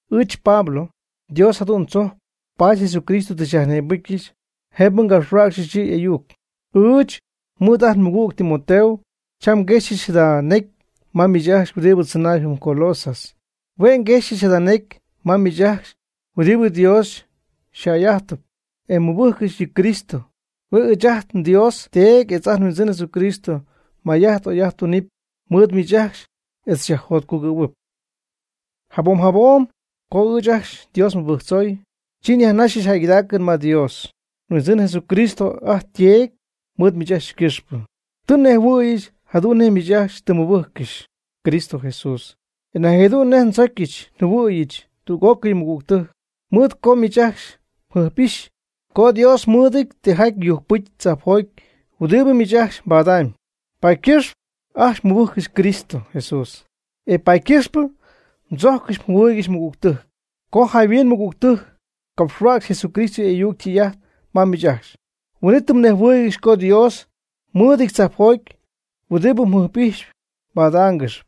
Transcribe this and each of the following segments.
Ɨɨch Pablo, Dios jadu'n tzojcp, paady Jesucristo tɨ xyajnïbɨcyɨch jëbɨ ngapxhuäcxyɨch yɨ 'y'ayuc. Ɨɨch mɨɨd ajt nmɨgüg Timoteo cham nguexyɨch jada necy ma miich ajcxy huɨdibɨ tzɨnaayb jɨm Colosas. Hue' nguexyɨch jada necy ma miich ajcxy huɨdibɨ Dios yjäy'ajtɨp e mmɨbɨjccɨxy yɨ Cristo. Huen ɨɨch ajt nDios Teedy etz ajt nHuindzɨn Jesucristo may'ajt oy'ajt tunɨpy mɨɨd miich ajcxy etz xyajjotcugɨ́ɨygɨxɨp. Jabom jabom co ɨɨch ajcxy Dios nmɨbɨjctzoy, chi nyajnaxɨch jäygɨdaacɨn ma Dios, nHuindzɨn Jesucristo ajt yTeedy, mɨɨd miich ajcxy ycɨxpɨ. Tɨ nnejhuɨ̈yɨch jadu'n nej miich ajcxy tɨ mmɨbɨjccɨxy Cristo Jesús, e nañ jadu'n nej mdzojccɨxy mjɨhuɨɨygɨxy tüg'ócɨy mɨgügtɨjc. Mɨɨd co miich ajcxy mjɨjp'ixy co Dios mɨɨdɨty tijaty yujcpɨcy tzajpjoty huɨdibɨ miich ajcxy mbadamyb, paady ycɨxpɨ ajcxy mmɨbɨjccɨxy Cristo Jesús, e paady ycɨxpɨ mdzojccɨxy mjɨhuɨɨygɨxy mɨgügtɨjc. Co jayhuin mɨgügtɨjc capxhuäcxy Jesucristo y'ayuc ytɨy'ajt ma miich ajcxy, huin'it tɨ mnejhuɨɨygɨxy co Dios mɨɨdɨty tzajpjoty huɨdi njɨjp'ijxyp mbadaangɨxp.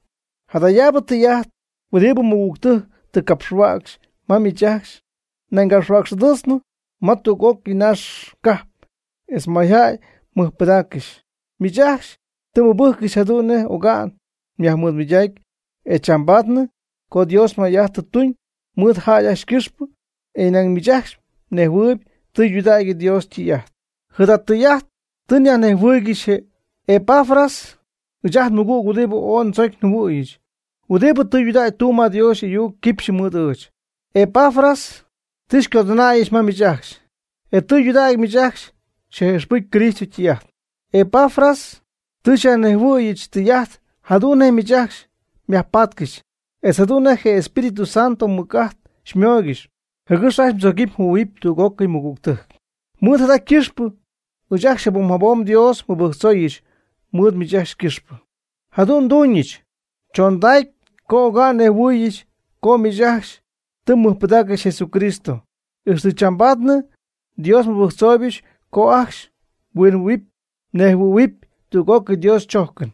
Jadayaabɨ tɨy'ajt huɨdibɨ mɨgügtɨjc tɨ capxhuäcxy ma miich ajcxy, nañ yajcapxhuäcx'adɨɨtznɨ ma tüg'ócɨy naax cajp etz mayjäy mɨjpɨdaaccɨxy. Miich ajcxy tɨ mmɨbɨjccɨxy jadu'n nej oga'n yajnimɨydacy e chambaadnɨ co Dios may'ajt tɨ tuñ mɨɨd jäy ajcxy ycɨxpɨ, e nañ miich ajcxy mnejhuɨɨyb tɨydudägy Dios ytɨy'ajt. Jada tɨy'ajt tɨ xyajnejhuɨɨygɨxy je Epafras, ɨɨch ajt nmɨgüg huɨdibɨ ooy ndzocy njɨhuɨ̈yɨch, huɨdibɨ tudägy tumb ma Dios y'ayuc quipxyɨ mɨɨd ɨɨch. Epafras tɨ xycodɨnäyɨch ma miich ajcxy, e tɨydudägy miich ajcxy xyaj'ijxpɨjcy Cristo ytɨy'ajt. Epafras tɨ xyajnejhuɨ̈yɨch tɨy'ajt jadu'n nej miich ajcxy myajpatcɨxy, etz jadu'n nej je Espíritu Santo ymɨc'ajt xymooygɨxy, jɨgɨx ajcxy mdzogɨpy mjɨhuɨ̈huɨpy tüg'ócɨy mɨgügtɨjc. Mɨɨd jada ycɨxpɨ ɨɨch ajcxy jabom jabom Dios nmɨbɨjctzooyɨch mɨɨd miich ajcxy ycɨxpɨ, jadu'n nduuñɨch chondacy co oga'n nnejhuɨɨyɨch co miich ajcxy tɨ mmɨjpɨdaaccɨxy Jesucristo, ixtɨ chambaadnɨ. Dios nmɨbɨjctzooybɨch co ajcxy mhuinjɨhuɨ̈huɨpy mnejhuɨ̈huɨpy tüg'ócɨy Dios chojcɨn.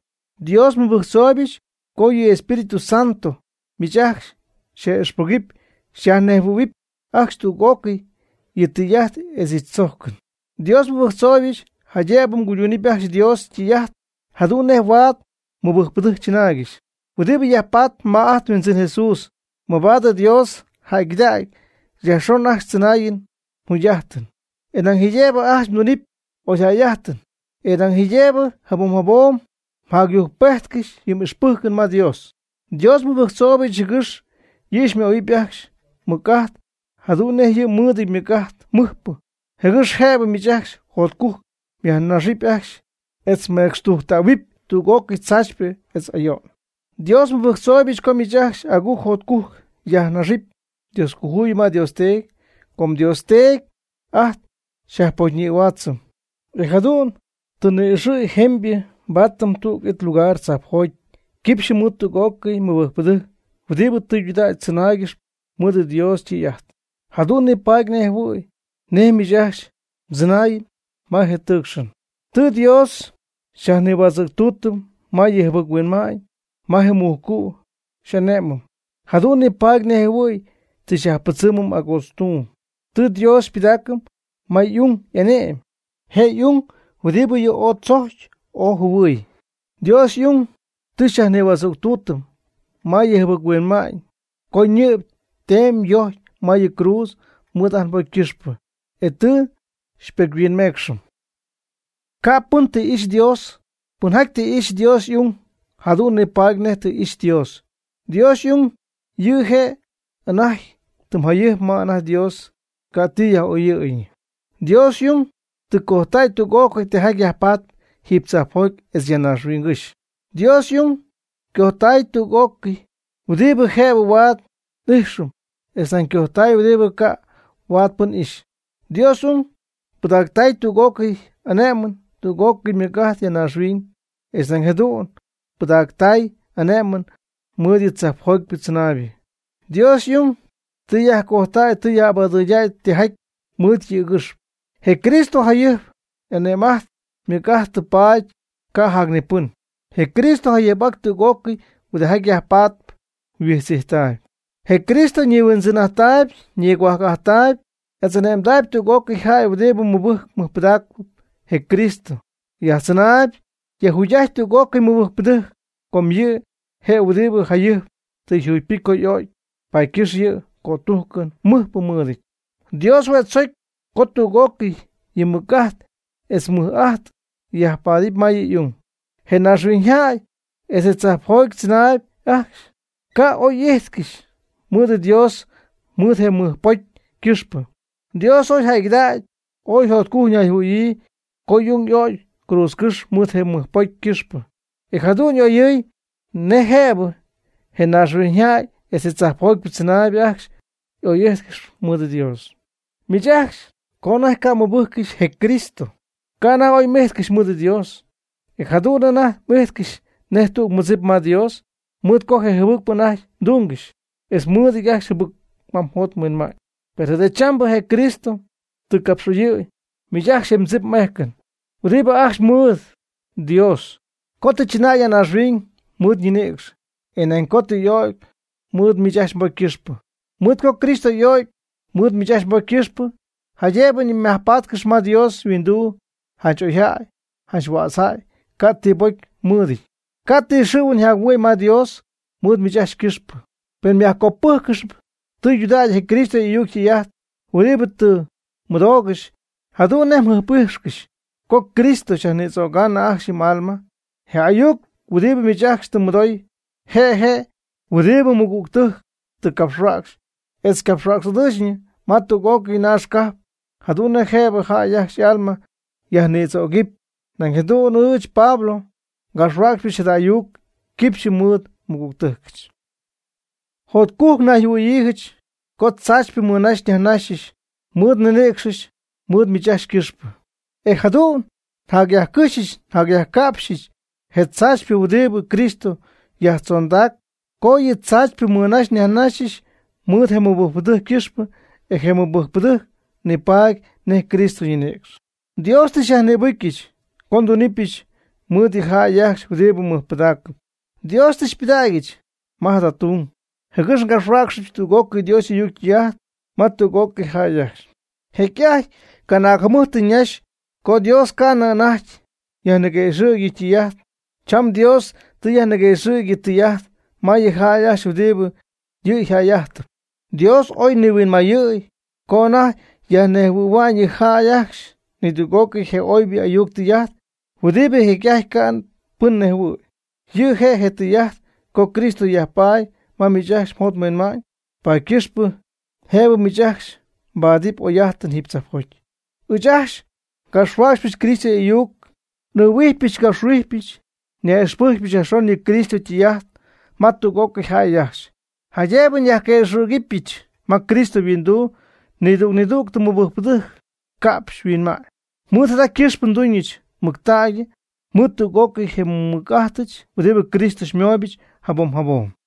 Dios nmɨbɨjctzooybɨch co yɨ' Espíritu Santo miich ajcxy xyaj'ijxpɨgɨpy xyajnejhuɨ̈huɨpy ajcxy tüg'ócɨy yɨ' ytɨy'ajt etz yɨ' chojcɨn. Dios nmɨbɨjctzooybɨch jaydëbɨ mguyduunɨp ajcxy Dios ytɨy'ajt jadu'n nej huaad mɨbɨjcpɨdɨjc chɨnaaygɨxy huɨdibɨ yajpaatp ma ajt nHuindzɨn Jesús, mabaad Dios jäygɨdägy yajxon ajcxy mdzɨnaayɨn mjugy'ajtɨn. E nañ jaydëbɨ ajcxy mdunɨpy oyjäy'ajtɨn. E nañ jaydëbɨ jabom jabom yjacyujcpejtcɨxy yɨ m'ixpɨjcɨn ma Dios. Dios nmɨbɨjctzooybɨch jɨgɨx yɨ' xymöhuɨpy ajcxy mɨc'ajt jadu'n nej yɨ' mɨɨdɨty ymɨc'ajt mɨjpɨ, jɨgɨx jëbɨ miich ajcxy jotcujc myajnaxɨpy etz mecxtujctähuɨp tüg'ócɨy tzaachypɨ etz ayo'n. Dios nmɨbɨjctzooybɨch co miich ajcxy agujc jotcujc myajnaxɨpy Dioscojuyip ma Dios Teedy, com Dios Teedy ajt xyajpocyñïhuaatzɨm, e jadu'n tɨ xyñi'ixɨɨyɨm jëbɨ nbaatɨm tüg it lugar tzajpjoty quipxyɨ mɨɨd tüg'ócɨy mɨbɨjcpɨdɨjc huɨdibɨ tɨydudägy tzɨnaaygɨxp mɨɨd Dios ytɨy'ajt, jadu'n nipaady nejɨhuɨ̈y nej miich ajcxy mdzɨnäy ma je tɨɨcxɨn. Tɨ Dios xyajnïhuädzɨ̈ctuutɨm ma yɨ jɨbɨc-huinma'ñ ma je mujcu' xy'ane'mɨm, jadu'n nipaady nejjɨhuɨ̈y tɨ xyajpɨdzɨmɨm agootztuum. Tɨ Dios xypɨdaacɨm ma y'ung y'ane'my, je' y'ung huɨdibɨ yɨ' ooy tzocy ooy jɨhuɨ̈y. Dios y'ung tɨ xyajnïhuädzɨ̈ctuutɨm ma yɨ jɨbɨc-huinma'ñ co ñɨ'py temy yojcy ma yɨ cruudz mɨɨd ajt nbocy ycɨxpɨ, e tɨ xypocyhuinmeecxɨm. Ca' pɨn tɨ ixy Dios. Pɨnjaty tɨ ixy Dios y'ung, jadu'n nipaady nej tɨ ixy Dios. Dios y'ung yɨ' je' anajty tɨm jayɨjp ma anajty Dios ca' ti yaj'oyɨɨyñɨ. Dios y'ung tɨ cojtay tüg'ócɨy tijaty yajpaatp jiiby tzajpjoty etz ya naaxhuiñgɨ́xy. Dios y'ung cojtay tüg'ócɨy huɨdibɨ jëbɨ huaad n'ijxɨm etz nañ cojtay huɨdibɨ ca' huaad pɨn ixy. Dios y'ung pɨdaactay tüg'ócɨy y'ane'mɨn tüg'ócɨy mɨc'ajt ya naaxhuiñ, etz nañ jadu'n pɨdactay ane'mɨn mɨɨd yɨ tzajpjoty tzɨnaaybɨ. Dios y'ung tɨ yajcojtäy tɨ yaj'abadɨɨydäy tijaty mɨɨd yɨ̈gɨxp. Je Cristo jayɨjp y'ane'm'ajt ymɨc'ajt tɨ paady, ca' jac ni pɨn. Je Cristo yaj'ijtpy tüg'ócɨy huɨdijaty ya yajpatp huijtz'ijttaayb. Je Cristo ñihuindzɨn'ajttaayb ñigohuajc'ajttaayb, etz y'ane'mdaayb tüg'ócɨy jäy huɨdibɨ mɨbɨjcɨp mɨjpɨdaacɨp. Je Cristo yajtzɨnaayb yajjugy'ajtpy tüg'ócɨy mɨbɨjcpɨdɨjc, com yɨ' je' huɨdibɨ jayɨjp tɨ yjugypɨcy co y'o'cy. Paady ycɨxp yɨ' cötujcɨn mɨjpɨ mɨɨdɨty. Dios hue' tzojcy co tüg'ócɨy yɨ' ymɨc'ajt etz ymɨj'ajt yajpaadɨp ma yɨ' y'ung. Je naaxhuiñyjäy etz je tzajpjoty tzɨnaayb ajcxy ca'oy'ijtcɨxy mɨɨd Dios mɨɨd je mɨjpocy ycɨxpɨ. Dios oy jäygɨdägy ooy jotcujc nayjɨhuɨɨyɨ co y'ung y'o'cy cruudzcɨ́xy mɨɨd je mɨjpocy ycɨxpɨ e jadu'n oyɨɨy nej jëbɨ je naaxhuiñyjäy etz je tzajpjoty tzɨnaaybɨ ajcxy oy'ijtcɨxy mɨɨd Dios. Miich ajcxy co anajty ca' mmɨbɨjccɨxy je Cristo, ca' anajty oy m'ijtcɨxy mɨɨd Dios. E jadu'n anajty m'ijtcɨxy nej tüg mɨdzip ma Dios, mɨɨd co jɨbɨcpɨ anajty mdungɨxy, etz mɨɨdɨty ajcxy jɨbɨc ma mjot mhuinma'ñ. Per jadachambɨ je Cristo tɨ capx'oyɨ̈y miich ajcxy je mdzip m'ejcɨn huɨdibɨ ajcxy mɨɨd Dios, co tɨ chɨnäy ya naaxhuiñ mɨɨd ñinïcx, e nañ co tɨ y'ögy mɨɨd miich ajcxy mbocy ycɨxpɨ. Mɨɨd co Cristo y'o'cy mɨɨd miich ajcxy mbocy ycɨxpɨ, jaydëbɨ myajpáatcɨxɨpy ma Dios yhuinduu janch oyjäy, janch huätzjäy, ca' ti pocy mmɨɨdɨty, ca' ti xɨ̈huɨn yjac-huɨ'my ma Dios mɨɨd miich ajcxy ycɨxpɨ. Pen myajcopɨjccɨxyp tɨydudägy je Cristo y'ayuc ytɨy'ajt huɨdibɨ tɨ mmɨdoogɨxy, jadu'n nej mjɨjp'ijxcɨxy co je Cristo xyajnïdzögaanɨ ajcxy yɨ m'alma. Je ayuc huɨdibɨ miich ajcxy tɨ mmɨdooy, je' je' huɨdibɨ mɨgügtɨjc tɨ capxhuäcxy etz ycapxhuäcx'adɨɨchñɨ ma tug'ócɨy naax cajp, jadu'n nej jëbɨ jäy ajcxy y'alma yajnïdzögɨpy. Nañ jadu'n ɨɨch, Pablo ngapxhuäcxypɨch jada ayuc quipxy mɨɨd nmɨgügtɨjcɨch. Jotcujc nnayjɨhuɨ̈yiijɨch co tzaachypɨ nmɨnaxy nyajnaxyɨch mɨɨd nninïcxɨch mɨɨd miich ajcxy ycɨxpɨ e jadu'n njacyajcɨxy njacyajca'pxɨch je tzaachypɨ huɨdibɨ Cristo yajtzondac co yɨ' tzaachypɨ mɨnaxy yajnaxy mɨɨd je mɨbɨjcpɨdɨjc ycɨxpɨ e je mɨbɨjcpɨdɨjc ni paady nej Cristo ñinïcx. Dios tɨ xyyajnïbɨcyɨch co ndunɨpyɨch mɨɨd yɨ jäy ajcxy huɨdibɨ mɨjpɨdaacɨp. Dios tɨ xypɨdägyɨch ma jada tung, jɨgɨx ngapxhuäcxɨbɨch tüg'ócɨy Dios y'ayuc ytɨy'ajt ma tüg'ócɨy jäy ajcxy. Jecy'ajty canaag jɨmɨjt tɨ ñaxy co Dios ca'nɨ anajty yajniguëxɨ̈gy yɨ' ytɨy'ajt. Cham Dios tɨ yajniguëxɨ̈gy yɨ' ytɨy'ajt ma yɨ jäy ajcxy huɨdibɨ yɨ' yjäy'ajtɨpy. Dios oy nihuinmayɨɨy co anajty yajnejhuɨ̈hua'ñ yɨ jäy ajcxy nidüg'ócɨy je oybɨ ayuc tɨy'ajt huɨdibɨ jecy'ajty ca' pɨn nejhuɨɨy. Yɨ' je' je tɨy'ajt co Cristo yajpaady ma miich ajcxy mjot mhuinma'ñ, paady ycɨxpɨ jëbɨ miich ajcxy mbaadɨp oy'ajtɨn jiiby tzajpjoty. Ɨɨch ajcxy ngapxhuäcxypɨch Cristo y'ayuc, n'ɨɨhuijpyɨch ngapxhuijpyɨch, nyaj'ixpɨjcpyɨch yajxon yɨ Cristo ytɨy'ajt ma tüg'ócɨy jäy ajcxy, jaydëbɨ nyajquëxɨ̈gɨbɨch ma Cristo yhuinduu nidüg nidüg mɨbɨjcpɨdɨjc ca'pxy yhuinma'ñ. Mɨɨd jada ycɨxpɨ nduñɨch mɨctägy mɨɨd tüg'ócɨy je nmɨc'ajtɨch huɨdibɨ Cristo xymooybɨch jabom jabom.